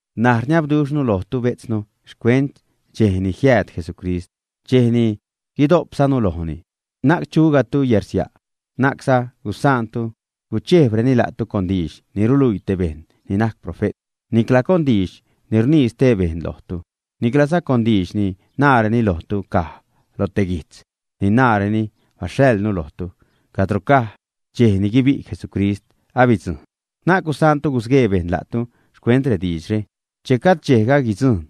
N̲aj, rniabduxhnu lojtu bejtznu, xcuent dxej ni jiääd Jesucrist, dxej ni guidojpzanu lojni, na'c chugajtu yarsia'. Na'cza gusaantu guchejbreni la'tu con diidx ni ruluii te bejṉ ni najc profe't, nicla con diidx ni rnii stee bejṉ lojtu, niclaza con diidx ni naareni lojtu caj loj te guijtz ni naareni baxhaḻnu lojtu, cadro caj “dxej ni guibi' Jesucrist abidzujṉ”. Na'c gusaantu gusguee bejṉ la'tu xcuent rediidxre. Che gajd dxejga guidzujṉ,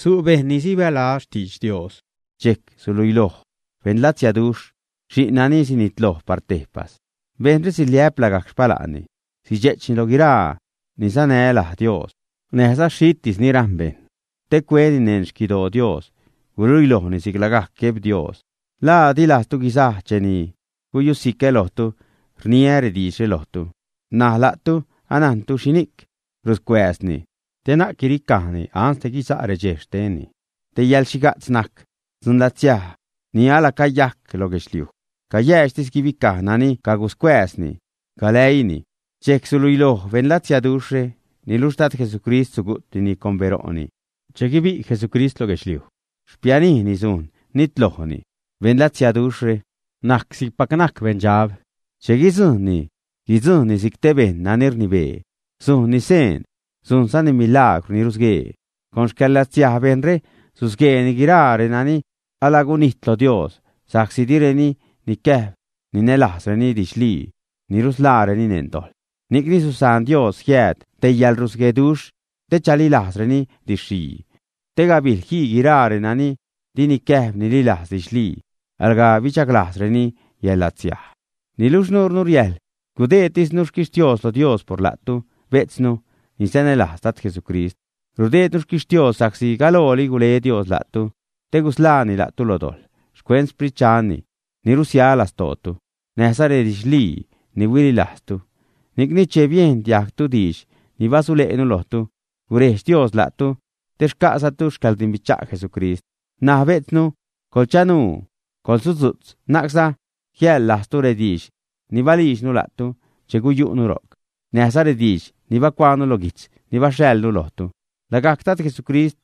su' bejṉ ni sibälaz xtidx Dios, dxejc suluiloj beṉlatsiaduxh, xi'n nani sinitloj par tejpas. Bejṉre siliä'p lagajc xpala'nni, sidxe'chni lo guiraa ni sanä laj Dios, näjza xhitis ni rajṉ bejṉ, te cueni neṉ xquidoo Dios, guluilojni si'c lagajc Gueb Dios. ¿La di lajztu guisaj cheni guyusicä lojtu, rniä rediidxre lojtu, ä? N̲aj la'tu anajntu xhini'c ruscuääzni, te na'c guiricajni ansde guisa' redxej xtenni. Te yäḻxhiga'tz najc dzunlatsiaj ni alacayajc lo guedxliuj, cayäädxtis guibicaj nani caguscuääzni galäiini. Dxejc suluiloj beṉlatsiaduxhre. Niluxh Dad Jesucrist, sugu'tnini con bero'ni, che guibi' Jesucrist lo guedxliuj xpianijni sujn nitlojni. Beṉlatsiaduxhre najc si'cpac najc beṉdxab. Che guidzujṉni, guidzujṉni si'c te bejṉ nani rnibee, sujnni seen, sujnzani milagrw ni rusguee. Con xcäḻlatsiaj bejṉre susgueeni guiraa renani alagunijt lo Dios sa'csi direni nicäjb ninälajzreni didxlii ni nusḻaareni neṉ dojḻ. Ni'cni susaan Dios jiääd te yäḻrusgueduxh te chalilajzreni didx-xhii. Te gabijl jii guiraa renani di nicäjb nililajz didxlii, alga bidxaglajzreni yäḻlatsiaj. Niluxh nuurnu riäjḻ gudeedtisnu xquixhtios lo Dios por la'tu, bejtznu, ni sanälajz Dad Jesucrist. Rudeednu xquixhtios sa'csi galooli gule Dios la'tu te gusḻaani la'tu lo dojḻ, xcuent Xsprit Dxanni ni rusia lastootu, näjza redidxlii ni huililajztu. Ni'cni che biejn diajgtu diidx ni basule'nu lojtu, gurejdx Dios la'tu, te xca'zatu xcäḻrdimbicha' Jesucrist. N̲aj bejtznu, coḻchanuu, coḻsudzu'tz, na'cza jiäḻlajztu rediidx ni balijdxnu la'tu che guyu'nu ro'c, näjza rediidx ni bacuaanu lo guijtz ni baxhaḻnu lojtu. Lagajc Dad Jesucrist,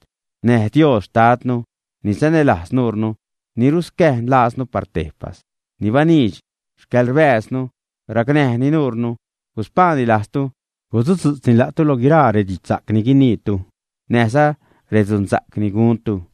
näj Dios Xtadnu, ni sanälajz nuurnu, ni ruscäjn lajznu par tejpas, ni baniidx xcäḻrbääznu racnäjni nuunu, guspaani lajztu, gusudzu'tzni la'tu lo guiraa redidxsa'c ni guiniitu näjza redzuunsa'c ni guntu.